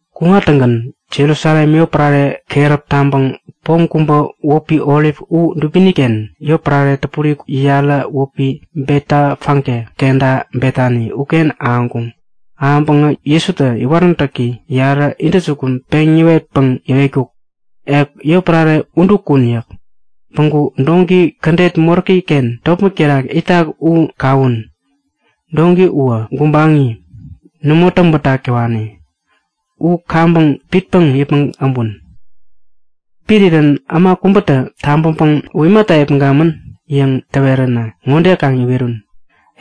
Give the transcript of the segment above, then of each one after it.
Kuŋtäŋgän Jerusalem yotpärare keräp taŋpäŋ pom kubä wäpi Olip u dubini-ken yotpärare täpuri yarä wäpi Betefage kenta Betani uken ahäŋkuŋ. Ahäŋpäŋä Jesutä iwaräntäki yarä intäjukun peŋ yäwetpäŋ yäwetkuk; Ek yotpärare udu kun yäk. Päŋku doŋki kädet moräki-ken topmäk terak itak u kawun. Doŋki uwä gubaŋi, nämo täŋbätak täwani. U kaŋpäŋ pitpäŋ yäpmäŋ äbun. Pirirän äma kubätä tabäŋpäŋ U imata yäpmäŋkamän? yäŋ täweränä ŋode kaŋ iwerun;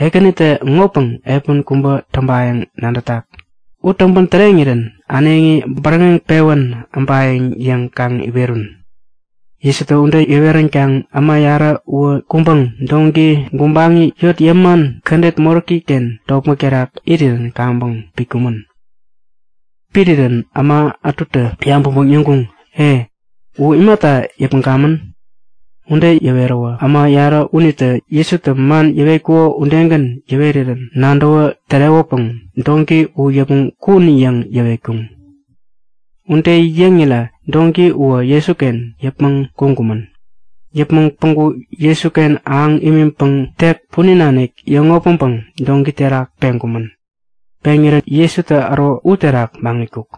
Ekänitä ŋopäŋ epän kubä täŋpayäŋ nadätak. U täŋpän täreŋirän äneŋi bäräŋeŋ pewän äbayäŋ yäŋ kaŋ iwerun. Jesutä ude yäweränkaŋ äma yarä uwä kuŋpäŋ doŋki gubaŋi yot yäman kädet moräki-ken topmäk terak irirän kaŋpäŋ pitkumän. Pirirän äma ätutä yabäŋpäŋ yäŋkuŋ; E, u imata yäpmäŋkamän? Ude yäweräwä äma yarä unitä Jesutä man yäwetkuko udegän yäwerirän nadäwä tärewäpäŋ Doŋki u yäpmäŋ kun! yäŋ yäwetkuŋ. Ude yäŋirä doŋki uwä Jesuken yäpmäŋ kuŋkumän. Yäpmäŋ päŋku Jesuken ahäŋ imiŋpäŋ tek punin nanik yäŋopmäŋpäŋ doŋki terak peŋkumän. Peŋirän Jesutä äro uterak maŋitkuk.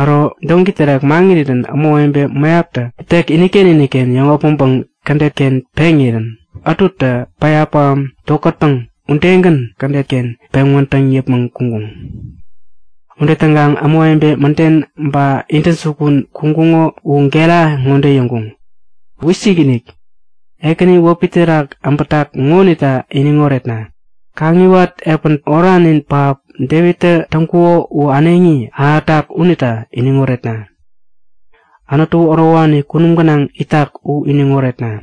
Äro doŋki terak maŋirirän ämawebe mäyaptä tek iniken iniken yäŋopmäŋpäŋ kädet-ken peŋirä ätutä päya pähäm tokätpäŋ udegän kädet-ken peŋ wädäŋ yäpmäŋ kuŋkuŋ. Ude täŋkaŋ ämawebe mäden ba intäjukun kuŋkuŋo u gera ŋode yäŋkuŋ; Wisikinik! Ekäni wäpi terak äbätak ŋonita iniŋ oretna! Kaŋiwat epän oranin pähap Devittä täŋkuko u äneŋi ahätak unita iniŋ oretna! Anutu ärowani kunum gänaŋ itak u iniŋ oretna!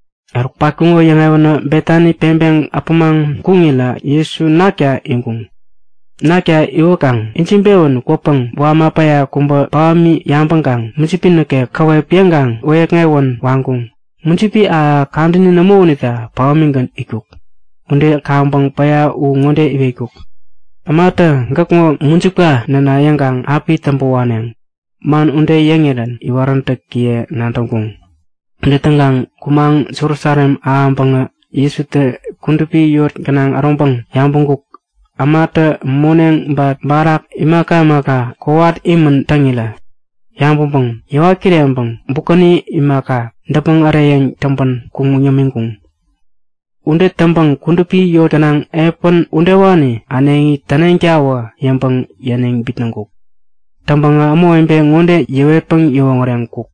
Eruk patkuŋo yäŋewänä Betani peŋpeŋ äpämaŋ kuŋirä Jesu nakta iŋkuŋ. Nakta iwäkaŋ ijiŋpewän kwäpäŋ wama päya kubä pähämi yabäŋkaŋ mujipi nikek käwep yäŋkaŋ wäyäkŋewän waŋkuŋ. Mujipi ahäk-ahäk kadäni nämo unita pähämigän itkuk. Ude kaŋpäŋ päya u ŋode iwetkuk; Ämatä gäkŋo mujipka näna yäŋkaŋ api täŋpä waneŋ! Man ude yäŋirän iwaräntäkiye nadäŋkuŋ. Ude täŋkaŋ kumaŋ Jerusalem ahäŋpäŋä Jesutä kudupi yot gänaŋ äroŋpäŋ yabäŋkuk; Ämatä moneŋ ba barak imaka imaka kowat imän täŋirä. Yabäŋpäŋ yäwat kireŋpäŋ bukäni imaka, däpmäŋ äreyäŋ täŋpän kuŋ yämiŋkuŋ. Ude täŋpäŋ kudupi yot gänaŋ epän udewani äneŋi täneŋtawä yäŋpäŋ yäniŋ bitnäŋkuk. Täŋpäŋä ämawebe ŋode yäwetpäŋ yäwoŋäreŋkuk;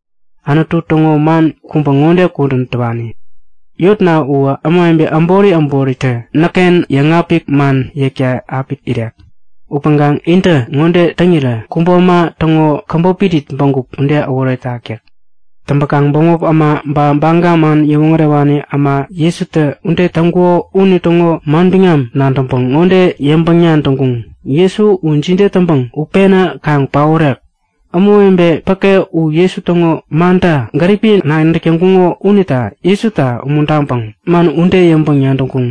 Anutu täŋo man kubä ŋode kudän täwani; Yotna uwä ämawebe äbori äboritä näkken yäŋapik man yäkta api irek. Upäŋkaŋ intä ŋode täŋirä kubo äma täŋo käbop irit bägup ude äworetak yäk. Täŋpäkaŋ bämop äma ba Baga man yäwoŋärewani äma Jesutä ude täŋkuko unitäŋo manbiŋam nadäŋpäŋ ŋode yäŋpäŋ-nadäŋkuŋ; Jesu u jide täŋpäŋ utpena kaŋ paorek? Ämawebe päke u Jesu täŋo manta gäripi nadäk täŋkuŋo unita Jesuta umuntaŋpäŋ man ude yäŋpäŋ-nadäŋkuŋ.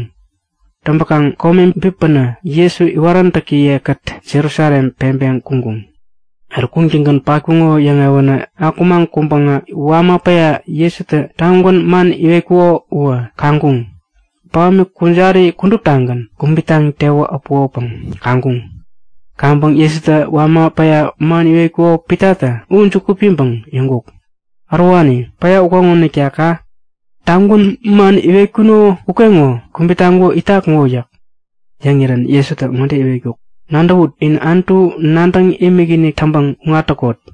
Täŋpäkaŋ kome bipänä Jesu iwaräntäkiye-kät Jerusalem peŋpeŋ kuŋkuŋ. Eruk kuŋtäŋgän patkuŋo yäŋewänä akumaŋ kuŋpäŋä wama päya Jesutä tagwän man iwetkuko uwä kaŋkuŋ; Pähämi kujari kuduptagän kubit taŋ tewä äpukopäŋ kaŋkuŋ. Kaŋpäŋ Jesutä wama päya man iwetkuko Pitatä u juku piŋpäŋ yäŋkuk; Ärowani, päya ukeŋonita ka! Tagwän man iwetkuno ukeŋo kubit taŋkuko itak ŋo yäk. Yäŋirän Jesutä ŋode yäwetkuk; Nadäwut! In Anutu nadäŋ imikinik täŋpäŋ kuŋat täkot!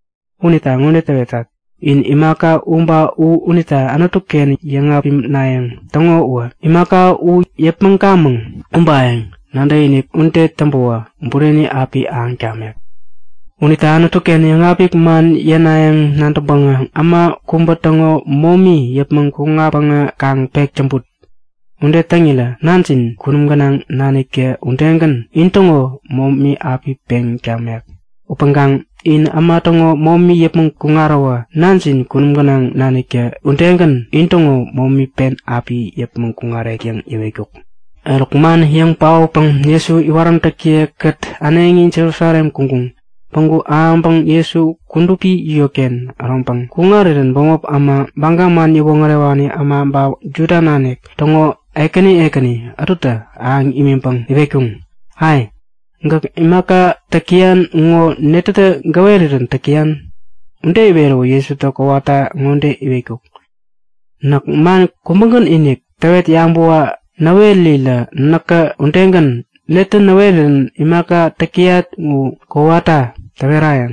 Unita ŋode täwetat; In imaka u ba u unita Anutu-ken yäŋapinayäŋ täŋo uwä imaka u yäpmäŋkamäŋ ubayäŋ nadäkinik ude täŋpäwä bureni api ahäŋ tamek. Unita Anutu-ken yäŋapik man yänayäŋ nadäŋpäŋä äma kubä täŋo momi yäpmäŋ kuŋatpäŋä kaŋ pek täŋput! Ude täŋirä Nanjin kunum gänaŋ naniktä udegän intäŋo momi api peŋ tamek. [ Upäŋkaŋ in äma täŋo momi yäpmäŋ kuŋaräwä Nanjin kunum gänaŋ naniktä udegän intäŋo momi pen api yäpmäŋ kuŋarek yäŋ yäwetkuk.] Eruk man yäŋ paotpäŋ Jesu iwaräntäkiye-kät äneŋi Jerusalem kuŋkuŋ. Päŋku ahäŋpäŋ Jesu kudupi yotken äroŋpäŋ kuŋarirän bämop äma, Baga man yäwoŋärewani äma ba Juda nanik täŋo ekäni ekäni ätutä ahäŋ imiŋpäŋ iwetkuŋ; Ai! Gäk imaka täk täyan ŋo netätä gäwerirän täk täyan? Ude iweräwä Jesutä kowata ŋode yäwetkuk; Näk man kubägän-inik täwet yabäwa näwerirä näkä udegän netä näwerän imaka täk täyat u kowata täwerayäŋ.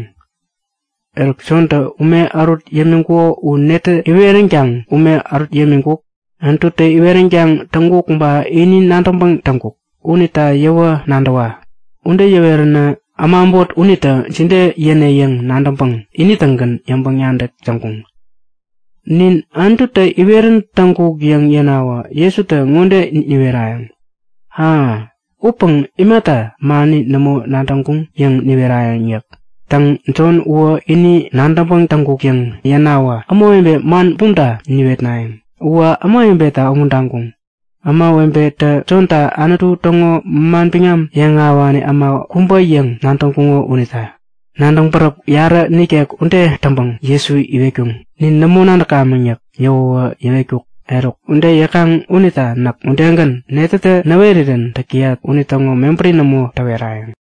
Eruk, Jontä ume ärut yämiŋkuko u netä iweränkaŋ ume ärut yämiŋkuk? Anututä iweränkaŋ täŋkuk ba ini nadäŋpäŋ täŋkuk? Unita yäwä nadäwa! Ude yäweränä äma äbot unita jide yäne yäŋ nadäŋpäŋ ini-tägän yäŋpäŋ-nadäk täŋkuŋ; Nin Anututä iwerän täŋkuk yäŋ yänawä Jesutä ŋode niwerayäŋ; A! Upäŋ imata mani nämo nadäŋkuŋ? yäŋ niwerayäŋ yäk. Täŋ, Jon uwä ini nadäŋpäŋ täŋkuk yäŋ yänawä ämawebe man bumta niwetnayäŋ. (Uwä ämawebeta umuntaŋkuŋ. Ämawebetä Jonta Anutu täŋo manbiŋam yäŋahäwani äma kubä yäŋ nadäŋkuŋo unita.) Nadäŋ-bäräp yarä nikek ude täŋpäŋ Jesu iwetkuŋ; Nin nämo nadäkamäŋ yäk. Yäwäwä yäwetkuk; Eruk, ude yäkaŋ unita näk udegän netätä näwerirän täk täyat unitäŋo mebäri nämo täwerayäŋ.